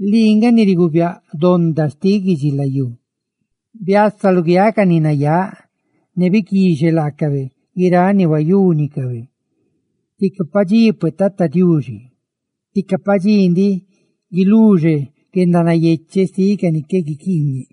Lii nga ni riguubiáꞌ donda xtiꞌ guidxilayú; ¡biasa luguiáꞌ ca ni nayáꞌ, ne biquixe laacabe guiráꞌ ni huayúnicabe! Tica padxí pue, Tata Diuxi, tica padxí ndiꞌ guiluxe guendanayecheꞌ xtiꞌ ca ni qué guiquiiñe.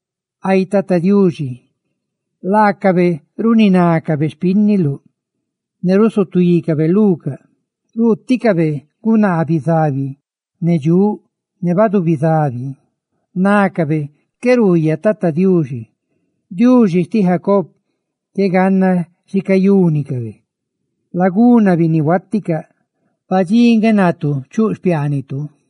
Ay Tata Diuxi, laacabe runinácabe xpínniluꞌ; ¡ne rusutuícabe lucaꞌ! Ruuticabe gunaa bizabi ne dxuꞌ; ne ruuticabe ca bizabi. Nácabe qué ruuyaꞌ Tata Diuxi, Diuxi xtiꞌ Jacob qué ganna xi cayúnicabe. ¡Laganna, binnihuaticaꞌ! Padxí nga natu chuꞌ xpiaanitu.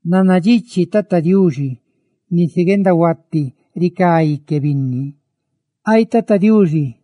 Nannadxichi Tata Diuxi nisi guendahuati ricá ique binni. Ay Tata Diuxi,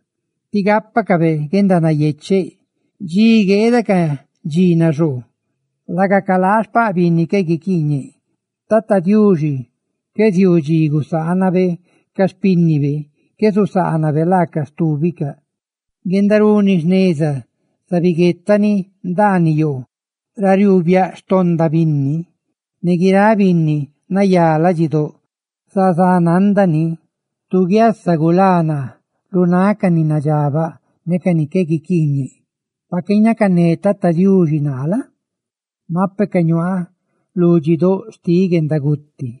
ti gápacabe guendanayecheꞌ dxi gueeda ca dxi naxoo, laga calaa ga xpaꞌ binni qué guiquiiñe. Tata Diuxi qué ziuu dxi gusaanabe ca xpínnibe, qué susaanabe laaca stúbicaꞌ. Guendaruni jneza zabiguetani ndaaniꞌ yoo ra riuu biaꞌ xtonda binni, ne guiráꞌ binni nayá ladxidóꞌ zazá nándani. Tu guiasa gulá naa lu náꞌ ca ni nadxabaꞌ ne ca ni qué guiquiiñe. Pa qué ñacané Tata Diuxi naa la? mape ca ñuaaꞌ lu dxí doꞌ xtiꞌ guendaguti.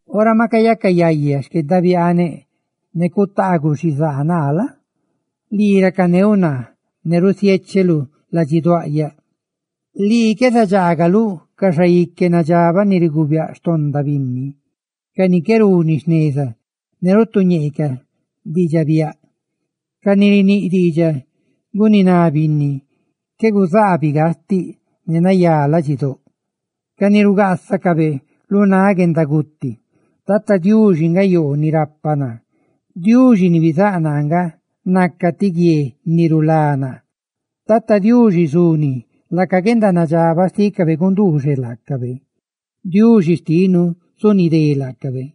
Ora maꞌ cayaca yayá xquendabiaaneꞌ ne cutaaguꞌ xizaa naa la? lii racaneuꞌ naa ne rusiécheluꞌ ladxiduaꞌyaꞌ. Lii qué zadxaagaluꞌ ca xaique nadxabaꞌ ni riguubiáꞌ xtonda binni, ca ni qué runi jneza ne rutuñeecaꞌ diidxaꞌ biaꞌ; ca ni riníꞌ xtiidxaꞌ guniná binni qué guzaabiꞌ gastiꞌ ne nayá ladxidóꞌ, ca ni rugaasacabe lu náꞌ guendaguti. Tata Diuxi nga yoo ni rapa naa; Diuxi ni bizáꞌ naa nga naca ti guie ni rulá naa. Tata Diuxi zuni laca guendanadxabaꞌ xtícabe gunduuxeꞌ laacabe. ¡Diuxi xtinu zunidé laacabe!